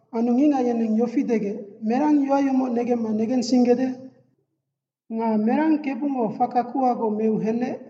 Anu ngicngac yeneng yofi degec, “Merang yoac yomoc negemma negensinggede? Nga merang KEBUNGO faka kuhagoc meu henec?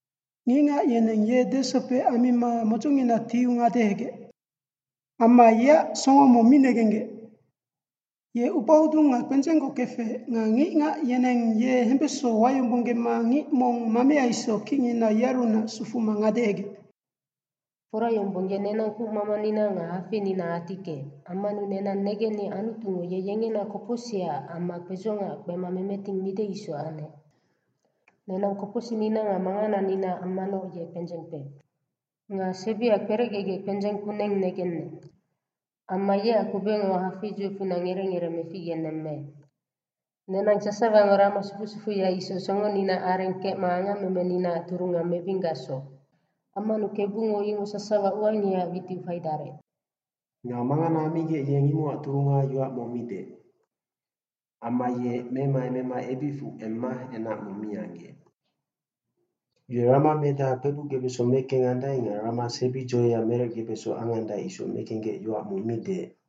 Ngicngac yeneng ye desopec ammima modzongina tiu ngadehegec. Amma yeac songo mong mi negenggec. Ye ubahodung nga kpendzenggoc kefec, nga ngicngac yeneng ye hembeso wayombonggema ngic mong mamea isoc kicngina yearunac sufuma ngadehegec.” Fora yombong ye nenang kucmamanina nga hafeinina atickeec, ammanu nenang negenni Anutungo ye yengena kopocsicac amma kpedzongaac kpema memeting mide isoc anec. Nenang kopocsicnina nga mangananinaac ammanoc ye kpendzeng kpeec. Nga sebia kperecgegec kpendzeng kuneng negenec. Amma yeac kubecngo hafeidzoicfunac ngerec ngerec meficgenemmeec. Nenang sasawango rama sufusufuya isoc songoninaac areng kecma angamemeninaac turunga mebinggacsoc. Ammanu KEBUNGO imoc sasawa uangihaac witiu faidarec. Nga mangana ammigec yeng imocac turunga yoac mong mi deec. Amma ye memaemema ebicfu emma enac mong mi anggeec. Ye rama medaha kpebucgebeso mekengandae nga rama sebi dzoeya merecgebeso angandae isoc mekenggec yoac mong mi deec.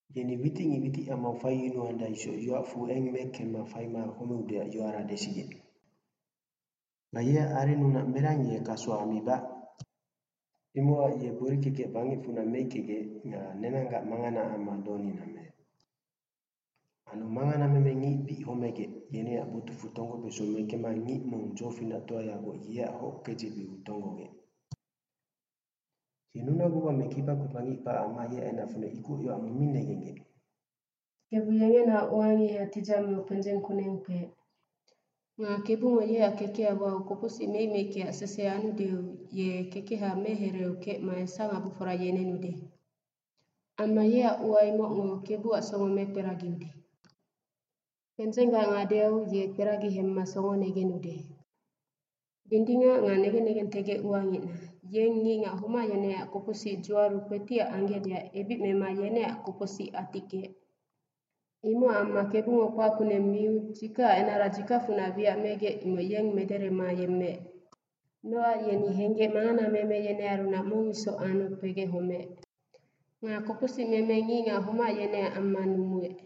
Yeni witicngic witicamau faiyunuandae isoc yoacfu eng mekemma faima homeudeac yoara desigec. Nga yeac arennunac merang ye kaso ammibac? Imocac ye gbori kekec bangecfunac meickegec, nga nenanggac manganaac amma donina meec. Anu manganameme ngic bic homegec, yeneac botucfu tonggobeso mekemma ngic mong dzofinactoayagoc yeac hockedzebeu tonggogec. Ye nunaguba me kibakpeba ngic kpac amma yeac enacfunac ikoc yoac mong mi negenggec. KEBU yengenaoc uangiha tidzameu kpendzeng kuneng kpeec. Nga KEBUNGO yeac kekeha wau kopocsic meicmeikeac sese anudeu, ye kekeha mehereeu kecma esangabofora yenenude. Amma yeac ua imocngo KEBUAC songo mekperagiude. Kpendzenggac ngadeau ye kperagi hemma songo negenude. Dindingac nga negen negentegegec uangicna, yeng ngicngac homac yeneac kopocsic dzuaru kpetiac anggecdeac ebic mema yeneac kopocsic atickeec. Imocac amma KEBUNGO kpac kuneng miu, dzikacac enara dzikacfunac wiac megec imoc yeng mederema yemmeec. Nocac ye henggec manganameme yenearunac mong isoc anu kpegec homeec. Nga kopocsicmeme ngicngac homac yeneac amma numuec.